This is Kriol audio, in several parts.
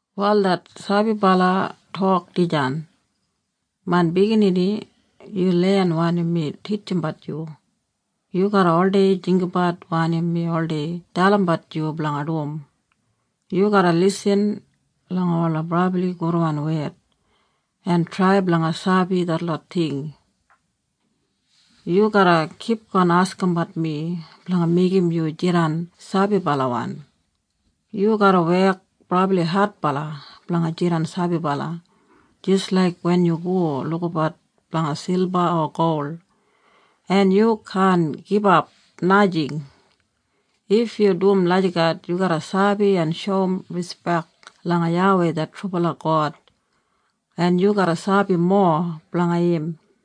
Wal det sabibala tok dijan, “Main biginini, yu len wanim mi titjimbat yu. Yu garra oldei jinggabat wanim mi oldei dalimbat yu blanga dum. Yu garra lisin langa ola brabli gudwan wed en trai blanga sabi detlot ting. Yu garra kipgon askimbat mi blanga meigim yu jidan sabibalawan. Yu garra wek brabli adbala blanga jidan sabibala, jis laik wen yu go lukabat blanga silba o gol, en yu kaan gibap, najing. If yu dum lagijat yu garra sabi en shoum rispek langa YAWEI det trubala God en yu garra sabi mowa blanga im.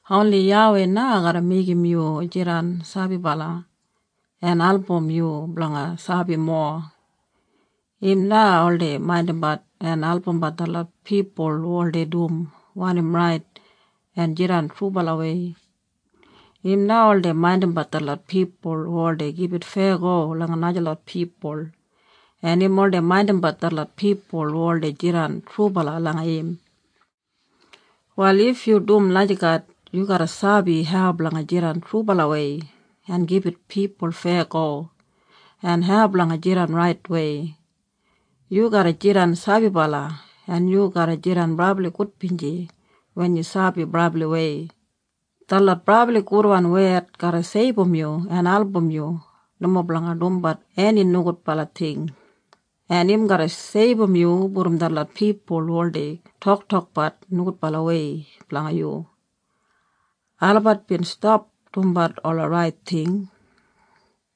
Oni YAWEI na garra meigim yu jidan sabibala, en album yu blanga sabi mowa. Im na oldei maindimbat en albumbat detlot pipul hu oldei dum wanim rait en jidan trubalawei. Im na oldei maindimbat detlot pipul hu oldei gibit feyago langa najalot pipul en im oldei maindimbat detlot pipul hu oldei jidan trubala langa im. “Wal if yu dum lagijat yu garra sabi hau blanga jidan trubalawei en gibit pipul feyago, en hau blanga jidan raitwei. Yu garra jidan sabibala en yu garra jidan brabli gudbinji wen yu sabi brabliwei. Detlot brabli gudwan wed garra seibum yu en album yu nomo blanga dumbat eni nogudbala ting, en im garra seibum yu brom detlot pipul hu oldei toktokbat nogudbalawei blanga yu. Olabat bin stap dumbat ola rait ting.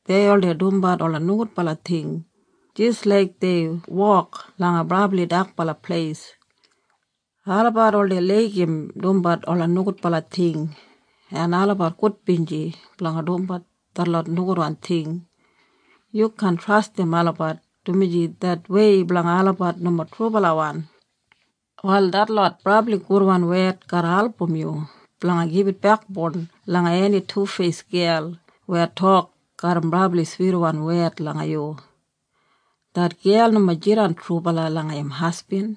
Dei oldei dumbat ola nogudbala ting jis laik dei wok langa brabli dakbala pleis. Olabat oldei laigim dumbat ola nogudbala ting en olabat gudbinji blanga dumbat detlot nogudwan ting. Yu kaan trastim olabat dumaji det wei blanga olabat nomo trubalawan. “Wal detlot brabli gudwan wed garra album yu blanga gibit bekboun langa eni tufeis gel weya tok garram brabli switwan wed langa yu. Det gel nomo jidan trubala langa im hasbin.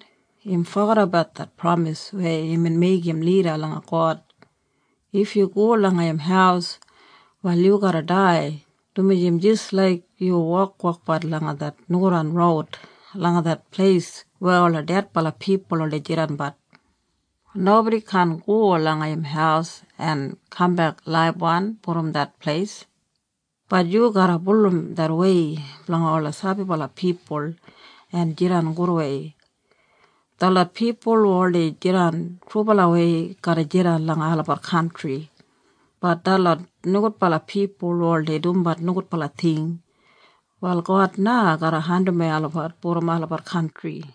Im fogedabat det pramis weya imbin meigim lida langa God. If yu go langa im haus, wal yu garra dai dumaji im jis laik yu wokwokbat langa det nogudwan roud langa det pleis weya ola dedbala pipul oldei jidanbat. Nobodi kaan go langa im haus en kambek laibwan brom det pleis. Bat yu garra bulurrum det wei blanga ola sabibala pipul en jidan gudwei. Detlot pipul hu oldei jidan trubalawei garra jidan langa olabat kantri. Bat detlot nogudbala pipul hu oldei dumbat nogudbala ting, wal God na garra andimwei olabat brom olabat kantri.”